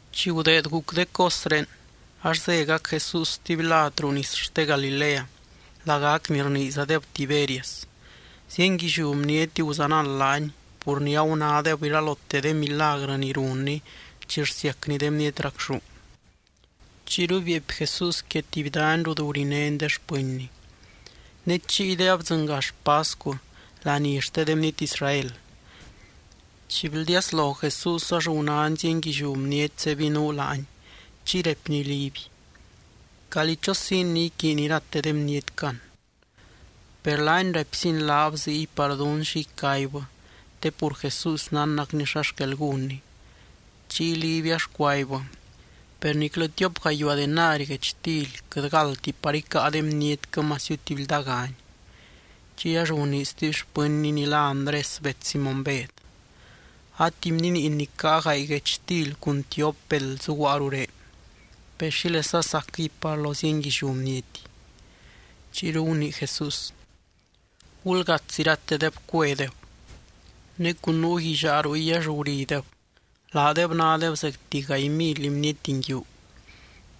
Chi gudeed guc de cosré, ax zégac Jesús stuby lad ruu nis xte Galilea, lagac ni rniizadeb Tiberias. Zienguilliú bniety guzanald laany, pur ni agunádeb iralote de milagrɨ ni runny chi rsiacny de bniety racxú. Chiyru bieepy Jesús quia tuby dany rut gurinény de xpɨnny. Ne chiyde abdzɨngax pascu, laní xte de bniety Israel. Chi bldiaslo Jesús ax gunány zienguilliú bniety zebinuu laany chiy raipny Liby: —¿Calí chosiin ni iquiiny irate de bnietquɨ an? Per laany raipziny laab ziy par dún xi icaibbɨ, te pur Jesús nánnacny xa xquel gúnny. Chiy Liby ax cuaibbɨ: —Per niclɨ tiop gayuaa denari guechtily quɨt galdti par icáa de bnietquɨ masiu tuby ldaagani. Chiy ax gunii stuby xpɨnny ni lá Andrés bets Simóny Bed: —A tuby bniniin ni caa gaay guechtily cun tiop beld zuguaa ruré. ¿Per xílesa sacquɨy par lo zienguilliú bniety? Chiyru gunii Jesús: —Gulgaats iratedeb cuedeb. Ne cun nuu guillaa ruy ax gurideb. Laadeb nádeb zecti gaay mily bniety nguiu.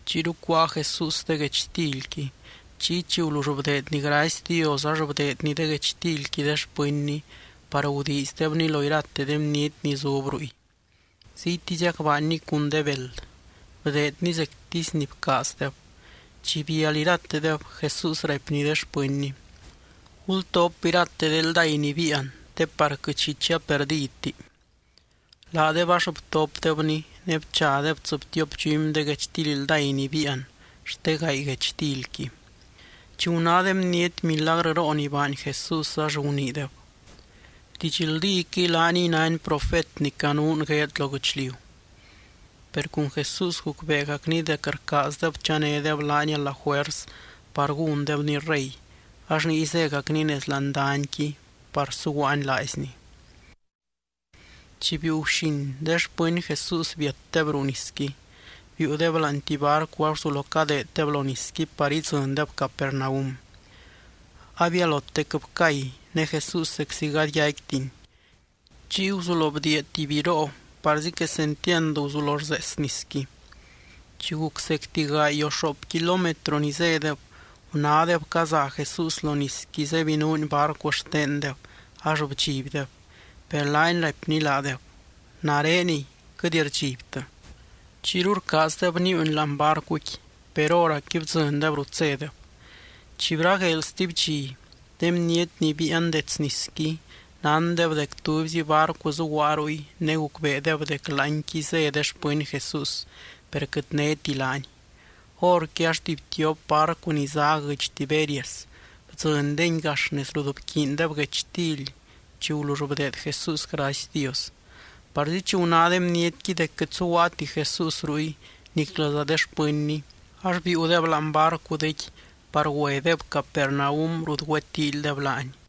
Chiyru cuáa Jesús de guechtilqui. Chiy chi gulull bdeedny gracy Dios ax bdeedny de guechtilqui de xpɨnny par gudiizdebni lo irate de bniety ni zub ruy. Ziytiziac baanny cun de beld. Bdeedny zectisy ni bcaazdeb. Chi bial iratedeb, Jesús raipny de xpɨnny: —Gultop irate de ldáy ni biian te par quɨt xi chia perdidti. Laadeb ax btopdebni ne bchadeb tsɨbtiop dxumy de guechtily ldáy ni biian xte gaay guechtilqui. Chi guná de bniety milagrɨroo ni baany Jesús ax guniideb: —Didxldíquɨy laaniy nány profet ni canuun gueed lo guɨchliu. Per cun Jesús gucbeegacny dec rcaazdeb chanédeb laany a la juers par gúndebny rey, ax niy zégacny nez láani danyqui par suguaany laaizny. Chi biiu guxin, de xpɨny Jesús biatdeb ruu nisqui, biiudeb láani tuby barcu ax guzulo cadeeddeb lo nisqui par idzɨndeb Capernaum. Abialotec bcay, ne Jesús zeczi gady yaicquitiny. Chiy guzulo bdiia tuby biroo parzi quesentiand guzulo rzees nisqui. Chi guc zecti gaay o xoop kilómetro ni zédeb, gunádeb caza Jesús lo nisqui zebinuuny barcu xtendeb ax bdxibdeb. Per laany raipny laadeb: —¡Nareniy, quɨt rdxibtɨ! Chiyru rcaazdeb níiuny láani barcuqui, per hóracqui bdzɨndeb rut zédeb. Chi bragueel stuby dxi, de bniety ni biian dets nisqui nándeb dec tubyzi barcu zuguaa ruy ne gucbeedeb dec láanqui zé de xpɨny Jesús, per quɨt néti laany. Horqui ax tuby tiop barcu ni zá guɨdx Tiberias bdzɨndengui gax nez rut bquiindeb guechtily chi gulull bdeed Jesús gracy Dios. Parzi chi guná de bnietqui dec quɨt zuguaati Jesús ruy niclɨza de xpɨnny, ax biiudeb láani barcudequi par güedeb Capernaum rut güetíilydeb laany.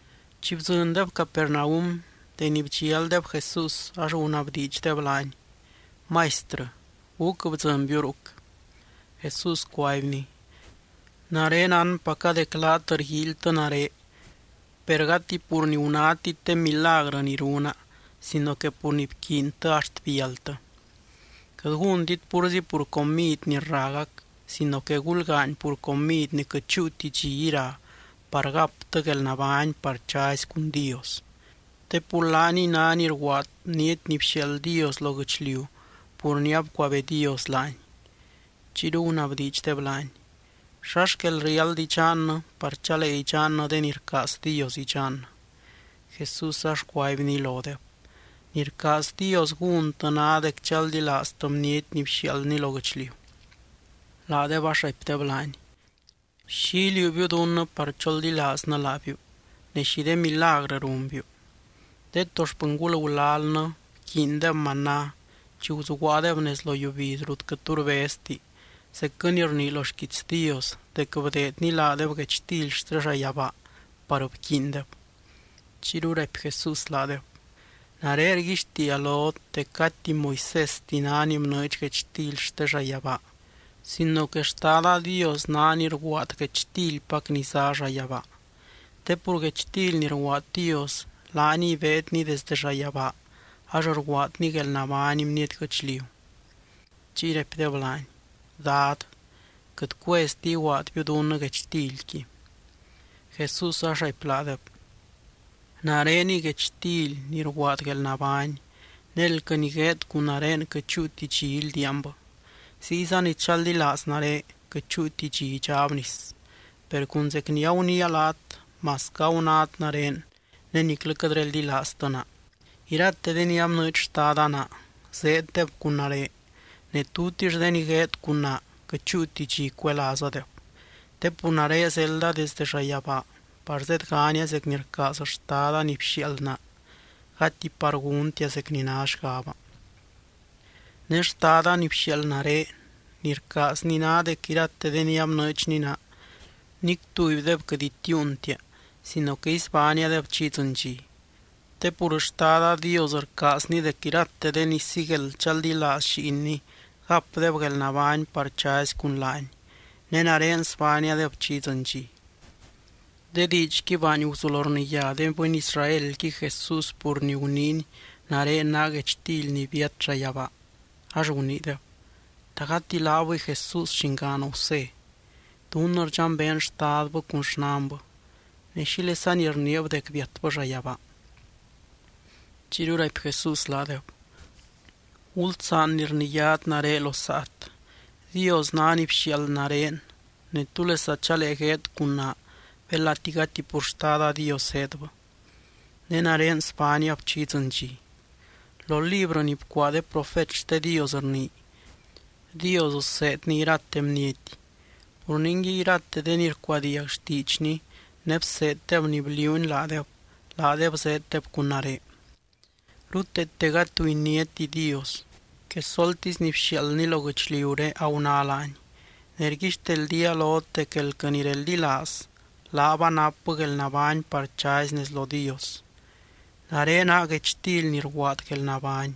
Chi bdzɨndeb Capernaum, deni bdxialdeb Jesús ax gunabdiidxdeb laany: —Maistrɨ, ¿gúc bdzɨnbiu ruc? Jesús cuaibny: —Nare nánpaca dec laat rguíilytɨ nare, per gati pur ni gunátit de milagrɨ ni runa sino que pur ni bquiintɨ axt bialtɨ. Quɨt gúntit púrzi pur comid ni rragac sino que gulgaany pur comid ni quɨt chúuti dxi ira par gaptɨ guelnabány par chazy cun Dios. Te pur laaniy ná ni rguaad Bniety ni bxiaald Dios lo guɨchliu pur ni abcuabee Dios laany. Chiyru gunabdiidxdeb laany: —¿Xa xquel riáld idxannɨ par chalee idxannɨ de ni rcaaz Dios idxannɨ? Jesús ax cuaibny lodeb: —Ni rcaaz Dios gúntɨ ná dec chaldilaaztɨ Bniety ni bxiaaldny lo guɨchliu. Laadeb ax raipdeb laany: —¿Xi iliuubiu dunnɨ par choldilaaznɨ laabiu ne xi de milagrɨ runbiu? De to xpɨngul gulalnɨ bquiindeb maná chi guzuguaadeb nez lo yiubiz rut quɨt tu rbezti, zecquɨ ni rnii lo xquiits Dios dec bdeedny laadeb guechtily xte llayabaa par bquiindeb. Chiyru raipy Jesús laadeb: —Nare rguixtiia lot dec gati Moisésti ná ni bnɨɨdx guechtily xte llayabaa sino que Xtada Dios ná ni rguaad guechtilpac ni zá llayabaa. Te pur guechtily ni rguaad Dios laaniy beedny desde llayabaa ax rguaadny guelnabány bniety guɨchliu. Chiy raipdeb laany: —Dad, quɨt cuezti iguaadbiu dunnɨ guechtilqui. Jesús ax raipy laadeb: —Nareniy guechtily ni rguaad guelnabány. Ne elquɨ ni gueed cun nare quɨt chúuti dxi ildiaanbɨ. Ziyza ni chaldilaaz nare quɨt chúuti dxi idxáb nis. Per cun zec ni aguniia laat, masquɨ agunát nare ne niclɨ quɨt reldilaaztɨ naa. Irate de ni abnɨɨdx Xtada naa, zeeddeb cun nare. Ne tutix de ni gueed cun naa, quɨt chúuti dxi cuelaazadeb. Te pur nare zelda desdɨ llayabaa par zedgania zec ni rcaaz Xtada ni bxiaald naa, gati par gúntia zec ni ná xgaba. Ne Xtada ni bxiaald nare, ni rcaazny ná dec irate de ni abnɨɨdxny naa nic tubydeb quɨt itiiuntia sino que isbániadeb chi idzɨny dxi. Te pur Xtada Dios rcaazny dec irate de ni sigueld chaldilaaz Lliinny gapdeb guelnabány par chazy cun laany. Ne nare sbániadeb chi idzɨny dxi. De diidxqui baany guzulo rniyá de bɨny Israelqui Jesús pur ni guniiny: “Nare naa guechtily ni biat llayabaa.” Ax guniideb: —¿Ta gati laabɨy Jesús, llingaan Gusé? Dunnɨ rdxambeen xtadbɨ cun xnanbɨ. Ne, ¿xílesani rniib dec biatbɨ llayabaa? Chiyru raipy Jesús laadeb: —Gulsaan ni rniyát nare lo saat. Dios ná ni bxiaald nare ne, ¿túlesa chalee gueed cun naa belati gati pur Xtada Dios zéedbɨ? Ne nare sbániab chi idzɨny dxi. Lo librɨ ni bcuaa de profet xte Dios rnii: “Dios seedny irate bniety.” Pur ningui, irate de ni rcuadiag xtiidxny ne bseeddeb ni bliuuny laadeb, laadeb zeeddeb cun nare. ’Ruteete gady tu iniáti Dios. Quesoltisy ni bxiaaldny lo guɨchliuré aguná laany. Ne rguixteldía lot dec elquɨ ni reldilaaz, laab anapbɨ guelnabány par chazy nez lo Dios. Nare naa guechtily ni rguaad guelnabány.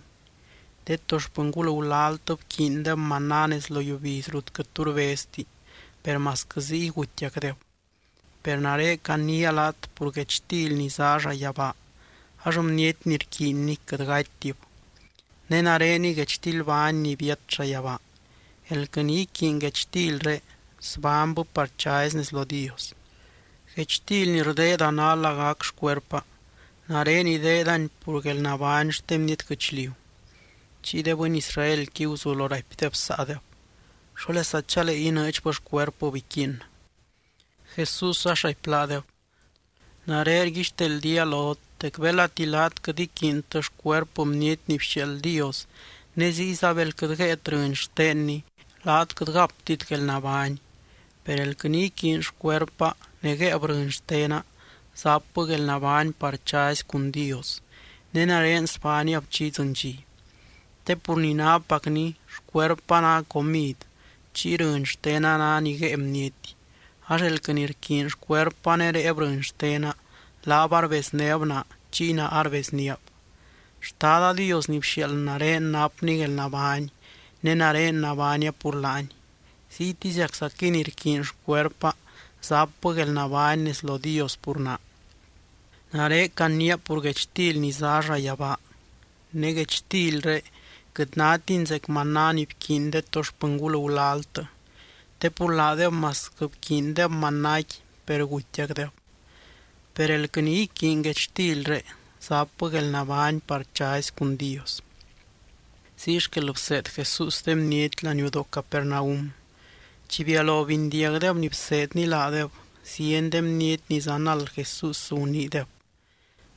De to xpɨngul gulaltɨ bquiindeb maná nez lo yiubiz rut quɨt tu rbezti, per masquɨ ziy gutiacdeb. Per nare caniia laat pur guechtily ni zá llayabaa, ax bniety ni rquiinni quɨt gatytib. Ne nareniy guechtilbány ni biat llayabaa. Elquɨ ni iquiiny guechtilré, zbánybɨ par chazy nez lo Dios. Guechtily ni rdeeda ná lagac xcuerpa. Nare ideedani pur guelnabány xte bniety guɨchliu. Chiy de bɨny Israelqui guzulo raipdeb saadeb: —¿Xólesa chalee inɨɨdxbɨ xcuerpɨb iquiinnɨ? Jesús ax raipy laadeb: —Nare rguixteldía lot dec belati laat quɨt iquiintɨ xcuerpɨ Bniety ni bxiaald Dios ne ziyza bel quɨt guéet rɨny xtenny, laat quɨt gaptit guelnabány. Per elquɨ ni iquiiny xcuerpa ne guéeb rɨny xtena, zapbɨ guelnabány par chazy cun Dios. Ne nare sbániab chi idzɨny dxi. Te pur ni nápacni xcuerpa ná comid, chiy rɨny xtena ná ni guée bniety. Ax elquɨ ni rquiiny xcuerpa ne réeb rɨny xtena, laab arbeznéb naa, chiy naa arbezníab. Xtada Dios ni bxiaald nare napny guelnabány, ne nare nabánia pur laany. Ziytiziaczaquɨy ni rquiiny xcuerpa zapbɨ guelnabány nez lo Dios pur naa. Nare caniia pur guechtily ni zá llayabaa. Ne guechtilré quɨt nátini zec maná ni bquiiny de to xpɨngul gulaltɨ te pur laadeb masquɨ bquiindeb manáqui per gutiacdeb. Per elquɨ ni iquiiny guechtilré, zapbɨ guelnabány par chazy cun Dios. Ziy xquel bseed Jesús de bniety laniudoo Capernaum. Chi bialo bindiagdeb ni bseedny laadeb, zieny de bniety ni zanald Jesús guniideb: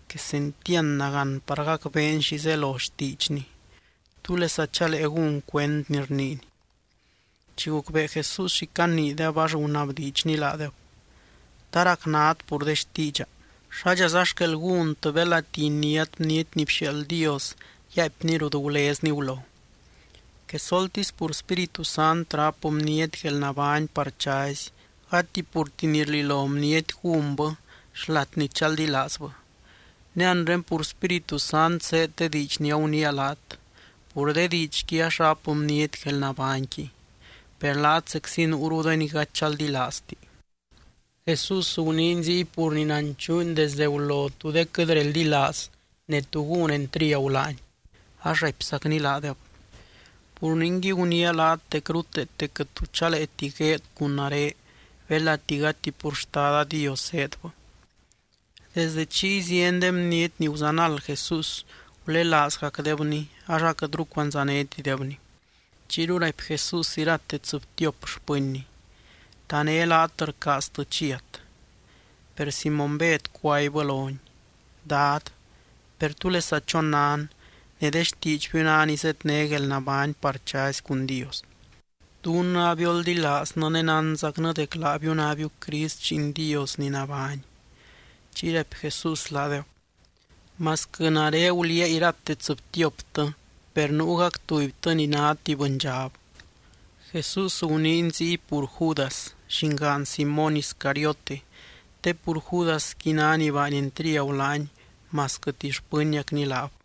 —Quesentiand nagán par gacbeen xi zelo xtiidxny. ¿Túlesa chalee gún cuend ni rniiny? Chi gucbee Jesús xi caniideb, ax gunabdiidxny laadeb: —¿Ta racnat pur de xtiidxa? ¿Xádxaza xquel gúntɨ belati iniát Bniety ni bxiaald Dios yaaipny rut gulezny gulo? Quesoltisy pur Spíritu Sant ráp bniety guelnabány par chazy, gati purti ni rlilo bniety gúnbɨ xlat ni chaldilaazbɨ. Ne anre pur Spíritu Sant zéed de diidx ni aguniia laat, pur de diidxqui ax ráp bniety guelnabányqui. Per laat zeczi nuuru de ni gady chaldilaazti. Jesús guniiny ziy pur ni nanchuuny desde gulo tú de quɨt reldilaaz, ne tú gún entriagu laany, ax raipzacny laadeb: —Pur ningui guniia laat dec ruteete quɨt tu chaleeti gueed cun nare belati gati pur Xtada Dios zéedbɨ. Desdɨ chiy zieny de bniety ni guzanald Jesús gulelaazgacdebny ax aquɨtru cuandzanétidebny. Chiyru raipy Jesús irate tsɨbtiop xpɨnny: —¿Ta né laat rcaaztɨ chiat? Per Simóny Bed cuaibbɨ lony: —Dad, per, ¿túlesa chonan? Ne de xtiidxbiu ná ni zedné guelnabány par chazy cun Dios. Dunnɨ abioldilaaznɨ ne nánzacnɨ dec laabiu nábiu Crist, Lliin Dios ni nabány. Chiy raipy Jesús laadeb: —Masquɨ nare guliaa irate tsɨbtioptɨ, per nuugac tubytɨ ni ná tuby bɨndxab. Jesús guniiny ziy pur Judas, llingaan Simóny Iscariote, te pur Judasqui ná ni baany entriagu laany masquɨ tuby xpɨniacny laab.